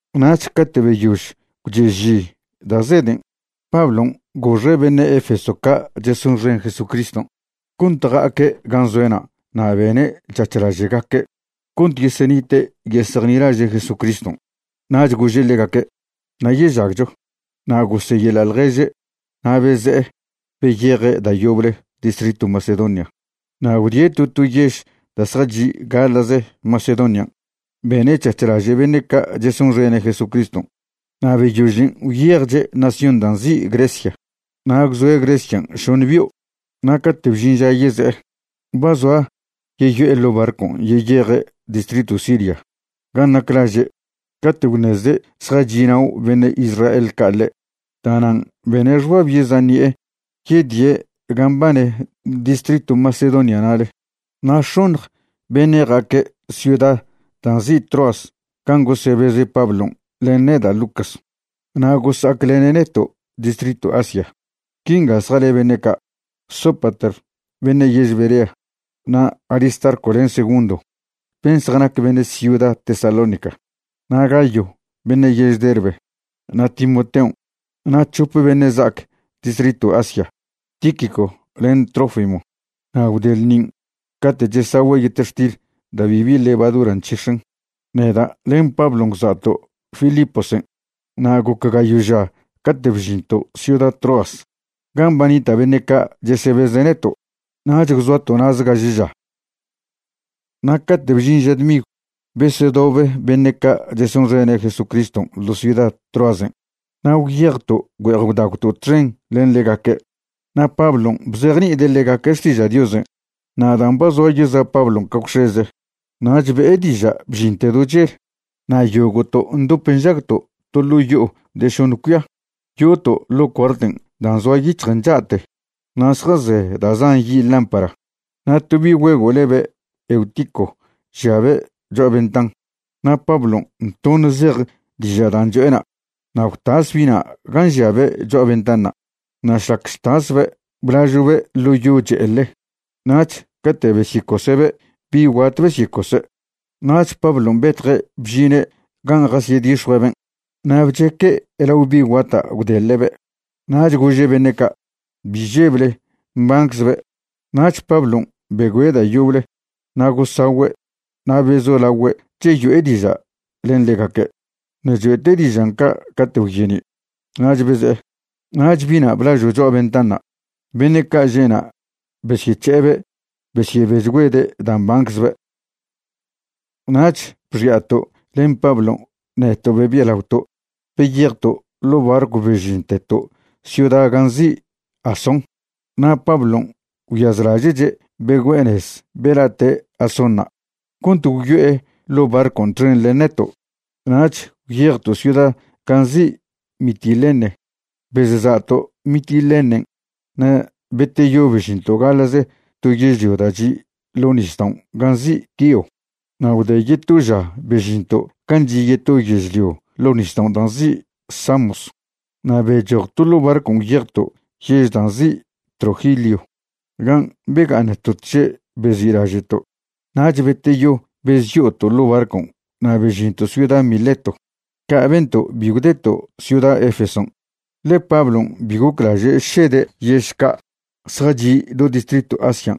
Nach cate' beyož gwche'ži da' zeden', Pablon' goxe' beṉe' Efeso ca' chesonxen Jesucriston' cont ja'aque' gan' zoe'na' na' bene' c̱hac̱h laže'gaque' cont yesenite' yesejnilaže' Jesucriston'. Nach gože' ḻegaque': “Nayežagcho”, na' goseyeḻa' ḻježe' na' beze'e beyeje' da' yoble distritw Macedonia. Na' gwdie' to to yež da' zjachi' gaḻa'ze Macedonian' bene' c̱hac̱h laže' beṉe' ca' chesonxene' Jesucriston', na' beyožen' gwyejche' nación da' nzi' Grecia. Na' gwzoe' Grecian' šoṉ bio'. Na' cate' bžin ža yeze'e, ba zoa yeyo'e ḻo' barcon' yeyeje' distritw Siria gan' nac laže' cate' gwṉezde' zjachi'nao' beṉe' Israel ca' ḻe'. Da'nan' bene' xbab yeza' ṉi'e yedie' gan' mbane distritw Macedonia na'le. Na' x̱oṉj beṉe' ja'aque' ciuda da' nzi' Troas gan' gosebeze' Pablon' len neda' Lucas, na' gosa'aclene' neto' distritw Asia. Quinga zjale beṉe' ca': Sópater, beṉe' yež Berea, na' Aristarco len Segundo ben' zjanac beṉe' ciuda Tesalónica, na' Gayo beṉe' yež Derbe, na' Timoteon' na' c̱hope beṉe' za'ac distritw Asia, Tíquico len Trófimo. Na' gwde ḻṉin' cate' chesagüe' yetextil da' bibi levadura nc̱hix̱en, neda' len Pablon' gwza'to' Filiposen' na' goc gayo' ža cate' bžinto' ciuda Troas gan' ba nita' beṉe' ca' chesebeze' neto', nach gwzoato' na'ze gaže ža. Na' cate' bžin ža dmigw besedobe beṉe' ca' chesonxene' Jesucriston' ḻo ciuda Troasen' na' gwyejto' güe'ej gwdagwto' txen len ḻegaque', na' Pablon' bzejni'ide' ḻegaque' xtiža' Diosen'. Na' dan' ba zoa yeza' Pablon' ca gwx̱eze nach be'e diža' bžinte do chel. Na' yogo'to' ndop nžagto' to ḻo' yo'o de šoṉ cuia, yo'oto' ḻo' cuarten' dan' zoa yic̱hjen cha'te, na' zjaze da' zan yi' lámpara. Na' to bi' güego' lebe' Eutico žiabe' cho'a ventan. Na' Pablon' toṉ zej diža' dan' cho'ena' na' gwtas bi'na' gan' žiabe' cho'a ventanṉa'. Na' šlac chtasbe' blažo'be' ḻo yo che'ele. Nach cate' besyecose'be' bi' guat besyecose'. Nach Pablon' betje' bžine' gan' jasyedix̱jue'eben' na' bcheque' lao bi' guata' gwdeḻe'be'. Nach gože' beṉe' ca': ―Bi žeble, mbanczbe'. Nach Pablon' begüe' da' yoble na' gosagüe' na' bezolagüe' cheyo'e diža' len ḻegaque'. Ṉe' choe'te' dižan' ca' cate' gwyeni'. Nach beze'e. Nach bi'na' blažo' cho'a ventanṉa', beṉe' ca' že'na' besyec̱he'ebe' besyebechgüede' dan' mbanczbe'. Nach bxi'ato' len Pablon' neto' bebialaoto' beyejto' ḻo' barcw bežinteto' ciuda gan' nzi' Asón na' Pablon' gwyazlaže'che' begüe'e nez bela'te' Asónṉa' cont gwyo'e ḻo' barcon' txen len neto'. Nach gwyejto' ciuda gan' nzi' Mitilene. Bezsa'to' Mitilenen' na' beteyo bežinto' gaḻa'ze to yežlio da' chi' ḻo' nisdaon' gan' nzi' Quío. Na' gwde yeto ža bežinto' gan' chi' yeto yežlio ḻo' nisdaon' da' nzi' Samos. Na' bechojto' ḻo' barcon' gwyejto' yež dan' nzi' Trogilio gan' bega'aṉto' tže' bezi'laže'to'. Nach beteyo bezyo'oto' ḻo' barcon' na' bežinto' ciuda Mileto. Ca' bento' bi gwdeto' ciuda Efeson', ḻe Pablon' bi goclaže' šede' yež ca' zjachi' do distritw Asian'.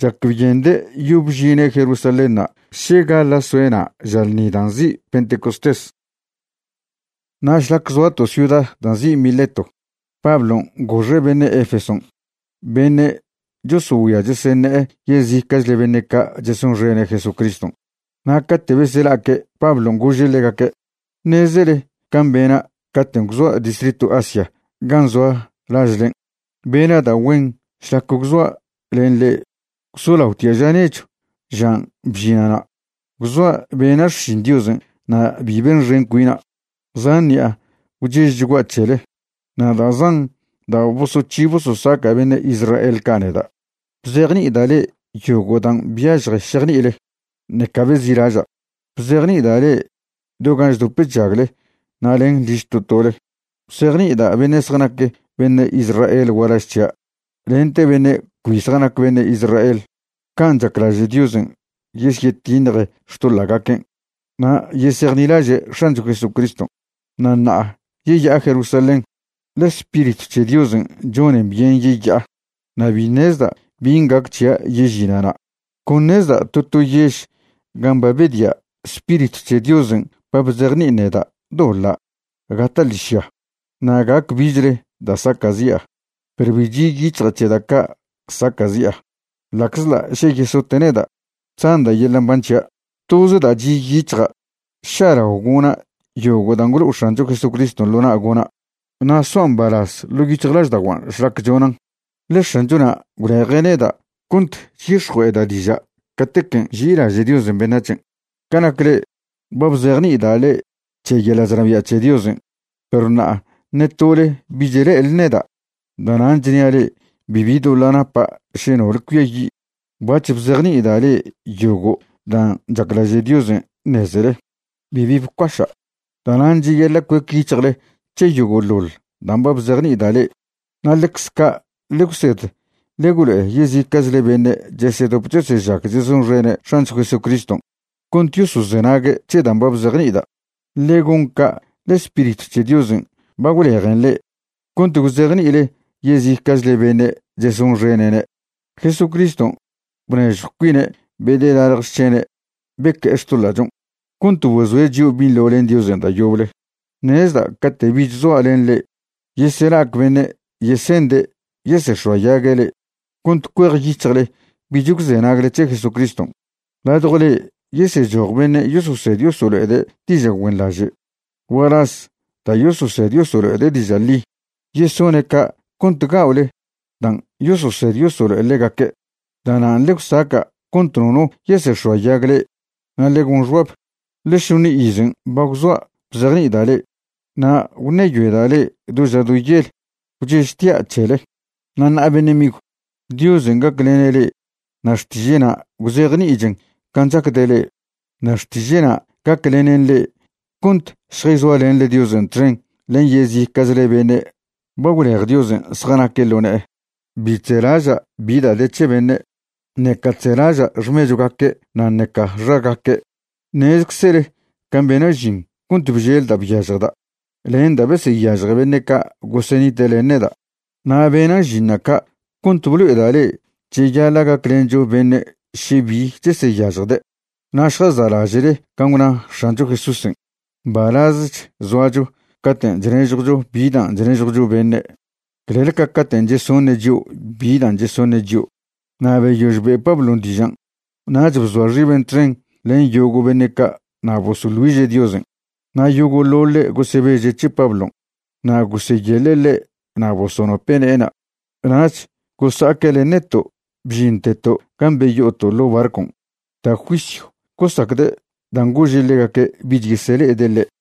Chacbyende' yob žine' Jerusalénṉa' še gaḻa' soe' na' ža lṉi dan' nzi' Pentecostés. Na' šlac zoato' ciuda da' nzi' Mileto Pablon' goxe' beṉe' Efeson' beṉe' chosogüia cheseṉe'e yezica'chle beṉe' ca' chesonxene' Jesucriston'. Na' cate' besela'aque' Pablon' gože' ḻegaque': ―Ṉezele can' bena' caten' gwzoa' distritw Asia gan' zoa lažlen', bena' da' güen šlac gwzoa' len le'e gwzolaotia' ža nechw žan' bžina' na'. Gwzoa' bena' xšin Diosen' na' bi benxen cuina'. Zan ṉi'a gwchežchgua' c̱hele. Na' da' zan da' bosoc̱hi bososaca' beṉe' Israel ca' neda'. Bzejni'ida' le'e yogo' dan' byažje šejni'ile, ṉeca bezi'laža', bzejni'ida' le'e do gan' chdop chžagle na' len liž to tole. Bzejni'ida' beṉe' zjanac beṉe' Israel gualaž c̱hia' lente beṉe' cbi zjanac beṉe' Israel can' chaclaže' Diosen' yesyetiṉje xtoḻa'gaquen' na' yesejnilaže' X̱ancho Jesucriston'. Na' ṉa'a yeya'a Jerusalén, ḻe Spiritw c̱he Diosen' chonen byen yeya'a, na' bi ṉezda' bin' gac c̱hia' yežina' na'. Con ṉezda' to to yež gan' ba bedia' Spiritw c̱he Diosen' ba bzejni'in neda' doḻa' gata' ḻižya na' gac bichle da' saca'zi'a. Perw bi chi' yic̱hja' c̱he da' ca' saca'zi'a. Ḻa'czḻa' še yesote' neda', chzanda' yeḻa' mban c̱hia'. Toze da' chi' yic̱hja' ša'lao gona' yogo' dan' gwlo' X̱ancho Jesucriston' ḻo na' gona', na' soa' mbalaz ḻo' yic̱hjlažda'oguan' šlac chonan', ḻe X̱anchona' gwleje' neda' cont chyix̱jue'eda' diža' catequen' nži'ilaže' Diosen' beṉac̱hen'. ’Ca nac le'e, ba bzejni'ida' le'e c̱he yeḻa' chnabia' c̱he Diosen', perw ṉa'a ṉe tole bich le'ele neda'. Da'nan' chnia' le'e bibi doḻa' napa' še nole cuiayi'. Bac̱h bzejni'ida' le'e yogo' dan' chaclaže' Diosen' ṉezele, bibi bcuaša'. Da'nan' cheyaḻa' cuec yic̱hjle c̱he yogo'ḻoḻ dan' ba bzejni'ida' le'e na' ḻecze ca' ḻe gwsed ḻe gwlo'e yezica'chle beṉe' chesedop chesežag chesonxene' X̱ancho Jesucriston' cont yosozenague' c̱he dan' ba bzejṉi'ida'. Ḻe gon ca' ḻe Spiritw c̱he Diosen' ba gwlejen le'e cont gwzejni'ile yezica'chle beṉe' chesonxene'ne'. Jesucriston' bnežjw cuine' bedelaḻj xc̱hene' beque'e xtoḻa'chon' cont bozoe' chio' binḻo len Diosen' da' yoble. Ṉezda' cate' bich zoa' len le'e yesela'ac beṉe' yese'nde' yesex̱oayague' le'e cont cuejyic̱hjle bich gwzenagle c̱he Jesucriston'. Ladjw le'e yesechoj beṉe' yososed yosolo'ede' diža' güenḻaže' gualaz da' yososed yosolo'ede' diža' ḻi. Yesone' ca' cont ga'ole dan' yososed yosolo'e ḻegaque'. Da'nan' ḻe gwsaca' cont nono yesex̱oayag le'e. Na' ḻe gon xbab, ḻe šoṉ izen' ba gwzoa' bzejni'ida' le'e na' gwṉeyoeda' le'e do ža do yel gwchežtia' c̱hele. ’Na' ṉa'a beṉe' migw, Diosen' gaclene' le'e na' xtiže'na' gwzejni'ichen can' chacde' le'e. Na' xtiže'na' gaclenen le'e cont šjayzoalenḻe Diosen' txen len yezica'chle beṉe' ba gwlej Diosen' zjanaque' ḻo ne'e. Bi chzelaža' bi da' de c̱he beṉe', ṉeca chzelaža' xmechwgaque' na' ṉeca xagaque'. Ṉezczele can' bena' žin cont bžel da' byažjda' len da' beseyažje beṉe' ca' gosenite' len neda'. Na' bena' žinṉa' ca' cont blo'eda' le'e cheyaḻa' gaclencho beṉe' še bi cheseyažjde'. Na' šjasa'laže'le can' gwna X̱ancho Jesúsen': “Mbalazech zoacho caten' chnežjwcho bi dan' chnežjwcho beṉe' clel ca caten' chesoṉe' chio' bi dan' chesoṉe' chio'.” Na' beyož be' Pablon' dižan' nach bzoa xiben' txen len yogo' beṉe' ca' na' bosoḻ güiže' Diosen'. Na' yogo'ḻoḻe' gosebeže' c̱he Pablon' na' goseyeḻe' ḻe' na' bosonope' ne'ena'. Nach gosa'aque' len neto' bžinteto' gan' beyo'oto' ḻo' barcon'. Da' juisyw gosacde' dan' gože' ḻegaque' bich yesele'ede' ḻe'.